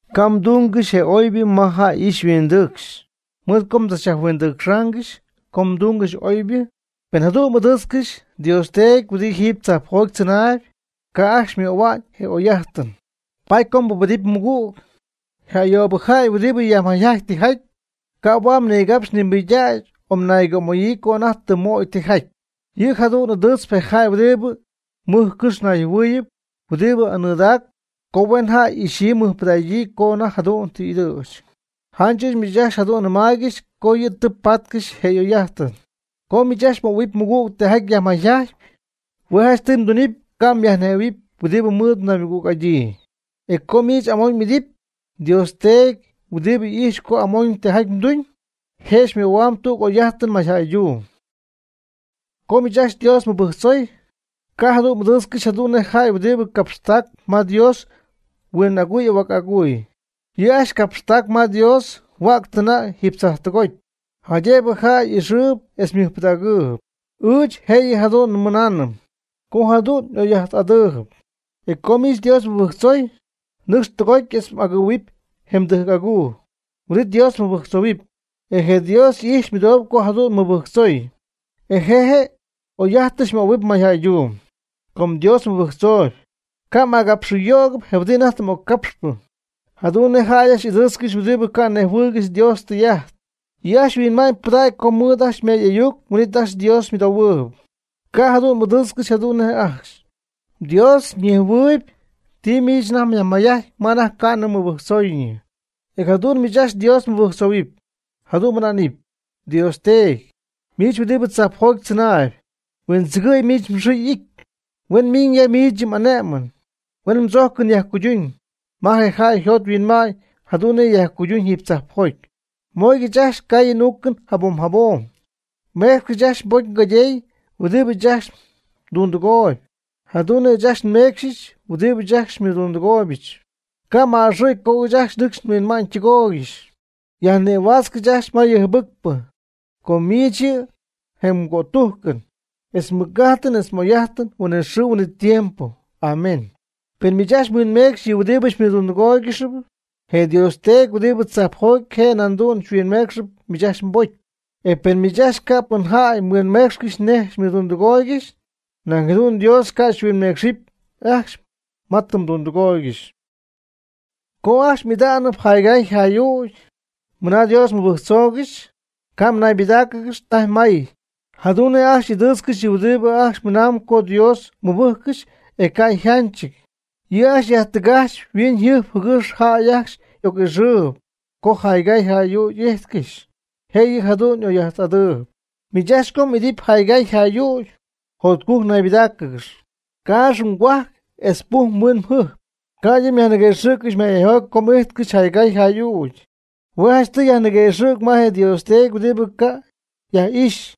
Ca' mdungɨxy je oybɨ ma jäy y'ixy yhuindɨcxy mɨɨd co mdzachyajhuindɨcxaangɨxy co mdungɨxy oybɨ. Pen jadu'n m'ɨdɨɨtzcɨxy mDios Teedy huɨdi jiiby tzajpjoty tzɨnaayb, ca' ajcxy xymöhua'ñ je oy'ajtɨn. Paady co mbubedɨpy mmɨgüg, je ayoobɨ jäy huɨdi yajmayjajtpy tijaty, ca' huaad mnigapxy mnimɨydägy o mnaygömayii co anajty tɨ mmöy tijaty. Yɨ' jadu'n ɨdɨɨtzp je jäy huɨdi mɨj cɨx nayjɨhuɨɨyɨp huɨdi anɨdaacp co huen jäy y'ixyii mɨjpɨdägyii co anajty jadu'n y'ɨdɨ̈ch. Janch ɨɨch miich ajcxy jadu'n nɨmaaygɨx co yɨ' tɨ patcɨxy je oy'ajtɨn. Co miich mmöhuɨpy mmɨgüg tijaty yajmayjajtpy, hue' janchtɨy mdunɨpy ca' myajnejhuɨ̈huɨpy huɨdi mɨɨd mnaymɨgüg'adyii. E co miich amoñ m'idɨpy, mDios Teedy huɨdi ijxp co amoñ tijaty mduñ, je' xymöhuamb tüg oy'ajtɨn mayjäyduum. Co miich ajcxy Dios mmɨbɨjctzoy, ca' jadu'n m'ɨdɨɨtzcɨxy jadu'n nej je jäy huɨdibɨ capxtacp ma Dios huin aguy ahuac aguy. Yɨ' ajcxy capxtacp ma Dios huäctɨna' jiiby tzajptɨgoty jaydëbɨ jäy y'ixɨɨyb etz ymɨjpɨdägɨɨyb. Ɨɨch jëyɨ jadu'n nɨmaayb, co jadu'n oy'ajtɨn'adɨɨby. E co miich Dios mmɨbɨjtzoy, nɨcx tɨgoty etz m'agɨ̈huɨpy je mdɨjc aguu. Huin'it Dios mɨbɨjctzou. E je Dios y'ijxpy ymɨdooyb co jadu'n mmɨbɨjctzoy, e je' je m'oy'ajtɨn xymöhuɨipy mayjäyduum. Com Dios mmɨbɨjctzoy, ca' m'agapxɨyo'cɨp je huɨdi anajty tɨ m'occapxpɨ, jadu'n nej ajcxy y'ɨdɨɨtzcɨxy huɨdi ca' nejhuɨɨygɨxy Dios ytɨy'ajt. Yɨ' ajcxy huinma'ñypɨdägy co mɨɨd ajcxy ymay'ayuc huin'it ajcxy ymɨdoohuɨɨyb. Ca' jadu'n m'ɨdɨɨtzcɨxy jadu'n nej je' ajcxy; mDios ñejhuɨɨyb ti miich ajcxy myajmayjajtpy ma anajty ca'nɨ mbɨjctzooyñɨ. E jadu'n miich ajcxy Dios mɨbɨjctzohuɨpy, jadu'n mɨna'nɨp: Dios Teedy, miich huɨdibɨ tzajpjoty tzɨnaayb; huindzɨgɨ̈y miich mxɨɨ y'ity. Huen miñ ya miich yɨ m'ane'mɨn. Huen mdzojcɨn yajcuyduñ ma je jäy yjot yhuinma'ñ jadu'n nej yajcuyduñ jiiby tzajpjoty. Mooygɨch ajcxy ngaayɨn n'uucɨn jabom jabom. Méecxɨbɨch ajcxy nbocy ngaydey huɨdibɨ ɨɨch ajcxy ndundɨgooyb, jadu'n nej ɨɨch ajcxy meecxyɨch huɨdibɨ ajcxy xymɨdundɨgooybɨch. Ca' m'a'ɨxɨ̈y co ɨɨch ajcxy nhuinma'ñ tɨgoyɨpɨch. Yajnïhuaatzcɨch ajcxy ma yɨ jɨbɨcpɨ. Co miich yɨ' mje' je cötujcɨn, je mɨc'ajtɨn etz je oy'ajtɨn huinɨxɨɨ huinɨtiempo. Amén. Pen miich ajcxy mhuinmeecxyp je huɨdibɨ xymɨdundɨgooygɨxp, je mDios Teedy huɨdibɨ tzajpjoty je' nañ jadu'n xyhuinmeecxɨp miich ajcxy mbocy. E pen miich ajcxy ca' pɨn jäy mhuinmeecxy nej xymɨdundɨgooygɨxy, nañ jadu'n mDios ca' xyhuinmeecxɨp ajcxy ma tɨ mdundɨgooygɨxy. Com ajcxy m'ida'nɨp jaygaay jay'ügy (mɨna Dios mmɨbɨjctzoogɨxy), ca' mnaybɨdáaccɨgɨxy tajy may, jadu'n nej ajcxy ɨdɨɨtzcɨxy yɨ' huɨdibɨ ajcxy mɨnamb co Dios mɨbɨjccɨxy e ca' yjanchɨty. Yɨ' ajcxy yajtɨgajchpy yhuiñyjɨjp jɨgɨx jäy ajcxy oc'ixɨɨyb co jaygaay jay'ügy y'ijtcɨxy; jëyɨ jadu'n oy'ajt'adɨɨyb. Miich ajcxy co m'idɨpy jaygaay jay'ügy jotcujc naybɨdägɨɨ, caax mgohuajc etz puj mhuin mjɨjp, ca'ydɨ myajniguëxɨ̈gy mayjäyjoty co m'ity jaygaay jay'ügy, hue' janchtɨy myajniguëxɨ̈g ma je mDeedy huɨdibɨ ca' yaj'ijxy;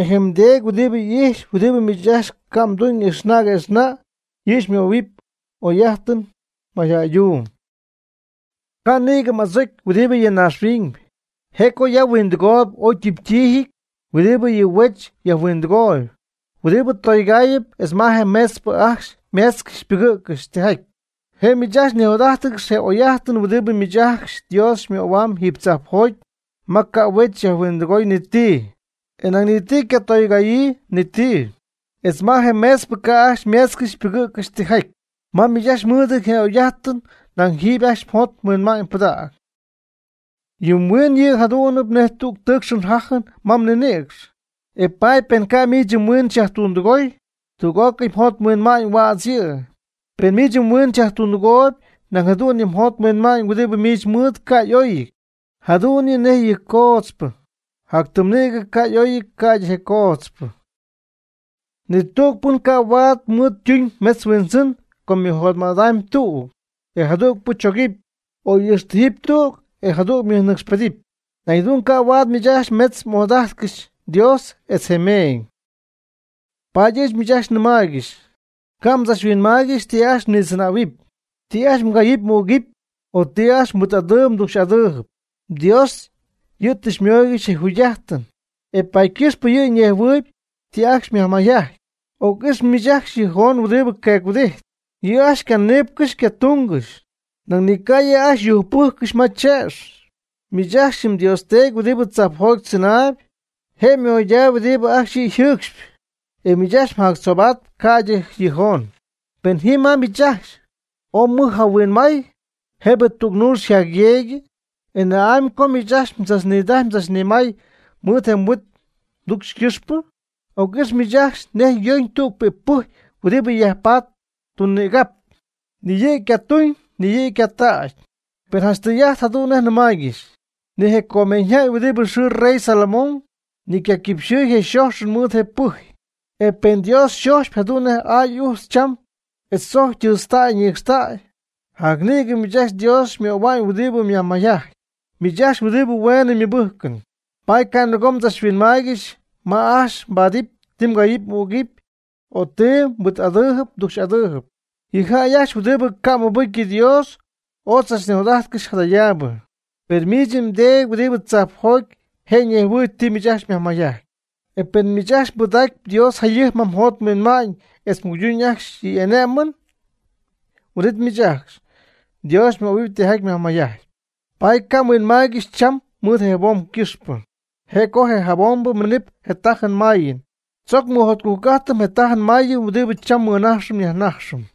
e je mDeedy huɨdibɨ ijxp huɨdibɨ miich ajcxy ca' mduñ ijxna' quëxna' yɨ' xymöhuɨpy oy'ajtɨn mayjäyduum. Ca' nïgɨ m'adzocy huɨdibɨ ya naaxhuiñ, je' co ya huindɨgooyb oy ytimtijɨty huɨdibɨ yɨ huech yajhuindɨgooyb, huɨdibɨ tougaayɨp etz ma je meetzpɨ ajcxy meetzcɨxy pɨgɨ̈ccɨxy tijaty. Je' miich nijot'ajtcɨxy je' oy'ajt huɨdibɨ miich ajcxy Dios xymöhuamb jiiby tzajpjoty ma ca' huech yajhuindɨgooy ni ti, e nañ ni ycatougaayii ni ti, etz ma je meetzpɨ ca' ajcxy meetzcɨxy pɨgɨ̈ccɨxy tijaty. Ma miich ajcxy mɨɨdɨty je oy'ajt nañ jiiby ajcxy mjot mhuinma'ñ pɨdäg. Yɨ mhuiɨn yɨ' yɨ' jadu'nɨp nej tüg tɨɨcxɨn jajɨn ma mnïnïcx, e paady pen ca' miich yɨ mhuiin xyajtundɨgoy, tüg'ócɨy mjot mhuinma'ñ huädz yɨ'. Pen miich mhuiin xyajtundɨgoyb nañ jadu'n mjot mhuinma'ñ huɨdi miich mɨɨd ca' y'oyɨty, jadu'n yɨ' nej coodzpɨ ¡jac tɨm nïgɨ ca' y'oyɨty ca'ydɨ je coodzpɨ! Ni tüg pɨn ca' huaad mɨɨd tuñ metz huindzɨn com mɨjotma'tɨ tüg je', e jadügpɨ chogɨpy; o ixtijɨpy tüg e jadüg ymɨgüg'adɨɨyb. Nañ jadu'n ca' huaad miich ajcxy metz m'ojadajtcɨxy, Dios etz je meeñ. Paady ɨɨch miich ajcxy nɨmaaygɨxy: Ca' mdzachhuinmaaygɨxy ti ajcxy mnitzɨnähuɨpy, ti ajcxy mgayɨpy m'ügɨpy o ti ajcxy mhuit'adɨɨyb mducxy'adɨɨyb. MDios yɨ' tɨ xymooygɨxy je mjugy'ajtɨn, e paady ycɨxpɨ yɨ' nejhuɨɨyb ti ajcxy myajmayjajtpy. Oc'ix miich ajcxy yɨ joon huɨdi queec-huɨdijtp. Yɨ' ajcxy ycaniipcɨxy ycatungɨxy, nañ ni ca' yɨ' ajcxy yujcpɨjccɨxy ma tze'x. Miich ajcxy mDios Teedy huɨdi tzajpjoty tzɨnaayb, je' moydaayb huɨdi ajcxy yɨ' yjɨɨcxyp. E miich ajcxy mjactzoobatp ca'ydɨ yɨ joon. ¿Pɨn ji ma miich ajcxy, ooy mɨj jahuinmay, jëbɨ tüg nuux yjacyeegyɨ? ¿E na'amy co miich ajcxy mdzachnidajy mdzachnimay mɨɨd je mhuit mducxy ycɨxpɨ? Oc'ix miich ajcxy nej yoñ tüg je pɨjy huɨdi yajpatp tun nïgap. Ni yɨ' ycatuñ ni piidy. Per janch tɨy'ajt jadu'n nej nɨmaaygɨxy, ni je comeeñyjäy huɨdi yxɨɨ rey Solomón, ni ycaquipxɨ̈y je' yxojxɨn mɨɨd je pɨjy. E pen mDios xojxpy jadu'n je aay ujtz cham etz tzojcy ytɨɨtztäy ñicxtäy, jac nïgɨ miich ajcxy Dios xymöhua'ñ huɨdibɨ myajmayjajtpy, miich ajcxy huɨdibɨ hueenɨ mmɨbɨjcɨn. Paady ca' nɨgoobɨ mdzachhuinmaaygɨxy ma ajcxy mbaadɨp ti mgayɨpy m'ügɨpy o ti mhuit'adɨɨyb mducxy'adɨɨyb. Yɨ jäy ajcxy huɨdibɨ ca' mɨbɨcy yɨ Dios oy tzach nijot'ajtcɨxy jadayaabɨ, per miich mDeedy huɨdibɨ tzajpjoty je' ñejhuɨɨyb ti miich ajcxy myajmayjajtpy. E pen miich ajcxy mbɨdacpy Dios jayɨjp ma mjot mhuinma'ñ etz mguydun ajcxy yɨ' y'ane'mɨn, huin'it miich ajcxy Dios xymöhuɨpy tijaty myajmayjajtpy. Paady ca' mhuinmaaygɨxy cham mɨɨd je jabom cɨxpɨ, je' co je jabombɨ ymɨmiñ je tajɨn mayɨn. Tzoc mɨjotcujc'ajtɨm je tajɨn mayɨn huɨdi cham nmɨnajx nyajnajxɨm.